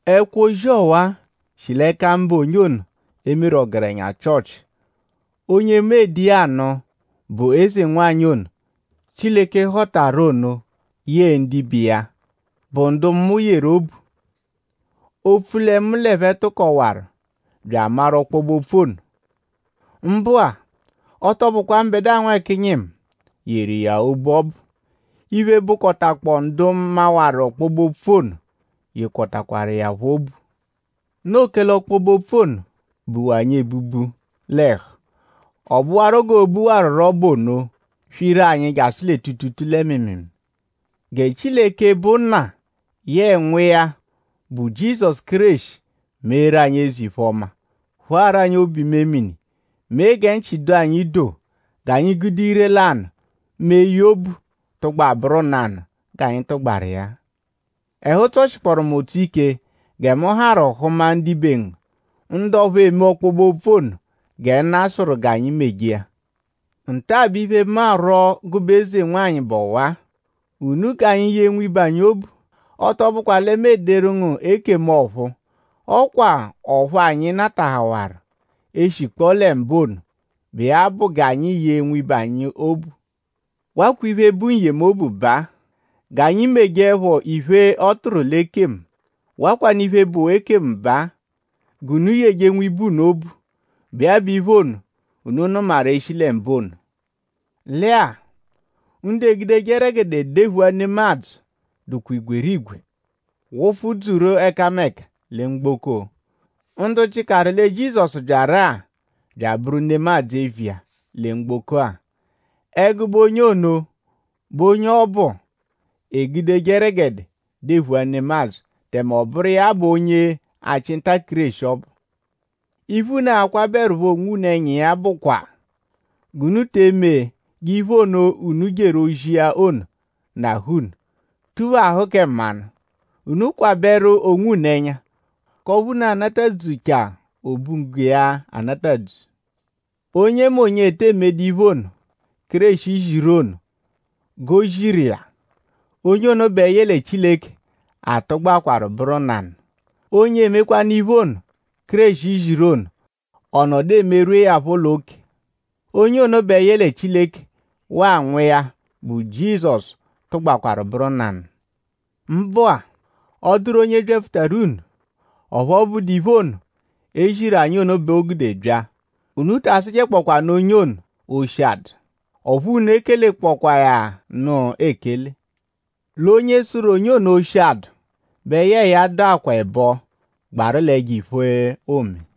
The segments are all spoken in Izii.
Ẹkwo-ozi ọwa-a shi l'ẹka mụbe onye e meru ọgerenya Chịochi. Onye mu ede iya anụ bụ eze-nwanyị ono, Chileke họtaru ono yẹe ndibe iya, bụ ndu mu yeru obu; opfu lẹ mu l'ẹphe tụkowaru bya amaru ọkpobe-opfu ono. Mbụ-a; ọ tọ bụkwa mbẹdua nwẹkinyi mu yeru iya obu ọbu. Iphe, bụkotakpoo ndu mawaru ọkpobe-opfu ono yekọtakwaru iya phọ obu. Noo kẹle ọkpobe-opfu ono buwa anyi ebubu l'ẹhu. Ọ bụru g'oo-buwarurọ bụ ono; swiru anyi jasụ lẹ tuutuutuu lẹ mịimiimii. Gẹ Chileke, bụ Nna yẹe Nwa iya, bụ Jizọsu Kéreshi meeru anyi eze-iphe-ọma; phụaru anyi obu-imemini; mee gẹ nchị dụ anyi doo g'anyi gude ire-lanụ mẹ eye obu tụgba bụru nanụ g'anyi tụgbaru iya. Ẹhu tsọshikporu mu ụtso ike gẹ mu harụ hụma ndibe ngu; ndu ọphu eme ọkpobe-opfu ono gẹ Nna sụru g'anyi meje iya. Nta-a bụ iphe, mu arwọ gụbe eze-nwanyị bụ ọwa-a: unu g'anyi yee nwibe anyi obu. Ọ tọ bụkwa lẹ mu ederu ngu ekemu ọ̀phúú; ọ kwa ọphu anyi natahawaru eshikpọo lẹ mbụ ono, bụ iya bụ g'anyi yee nwibe anyi obu. Wakwa iphe, bụ n-yemobu baa: g'anyi mejeẹpho iphe, ọ tụru l'ekemu. Wakwanụ iphe, bụ ekemu baa: g'unu yeje nwibe unu obu, bụ iya bụ iphe ono, unu nụmaru e -shi lẹ mbụ ono. Lẹ-a; ndu egudeje ẹregede dephua nemadzụ dụkwaa igwerigwe; wụfu dzuru ẹkameka lẹ mgboko; ndu jịkaru lẹ Jizọsu byaru-a bya abụru nemadzụ eviya lẹ mgboko-a. Ẹgube onye ono bụ onye ọbu, egudeje ẹregede dephua nemadzụ; tẹme ọ bụru iya bụ onye-achị-nta-Kéreshi ọbu. Iphe unu a-kwabẹerupho onwunu ẹnya iya bụkwa g'unu te eme g'iphe ono, unu jeru ozi iya ono nahụ unu; tuphahụ kẹ mmanụ. Unu kwabẹru onwunu ẹnya; k'ọphu unu a-natadzuchia obunggo iya anatadzu. Onyemonye, ete emejedu iphe ono, Kéreshi ziru ono g'o ziru iya; onye ono bẹ yẹle Chileke atụgbakwaru bụru nanụ. Onye emekwanụ iphe ono, Kéreshi ziru ono; ọ nọdu emerwuẹ ya phọ l'oke; onye ono bẹ yẹle Chileke waa Nwa iya, bụ Jizọsu tụgbaakwaru bụru nanụ. Mbụ-a; ọ -dụru onye byapfutaru unu; ọphu ọ bụdu iphe ono, e ziru anyi ono bẹ o gude bya; unu ta asụjekpokwaanu onye ono: oshi adụ; ọphu unu ekelekpọkwaa ya nụ ekele. L'onye sụru onye ono oshi-adụ bẹ yẹe ya dụkwaa ẹbo gbaru l'ẹjo-iphe, oome.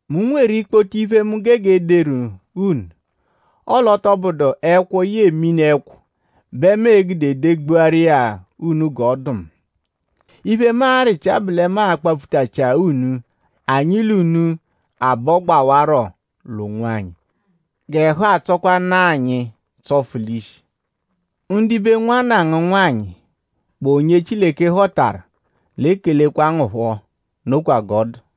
Mu nweru ikpoto iphe, mu gege ederu unu; ọle ọ tọ bụdu ẹkwo yẹe mini-ẹkwo bẹ mu e-gude degbuaru unu g'ọ dụ mu; iphe, mu arịchia bụ lẹ mu a-kpapfutachia unu; anyi l'unu abọgbawaro l'ọnu onwanyi; g'ẹhu atsọkwanu-a anyi tsọfu l'ishi. Ndibe nwanna ngu nwanyị, bụ onye Chileke họtaru l'ekelekwa ngu phọ. Nokwa g'ọ dụ.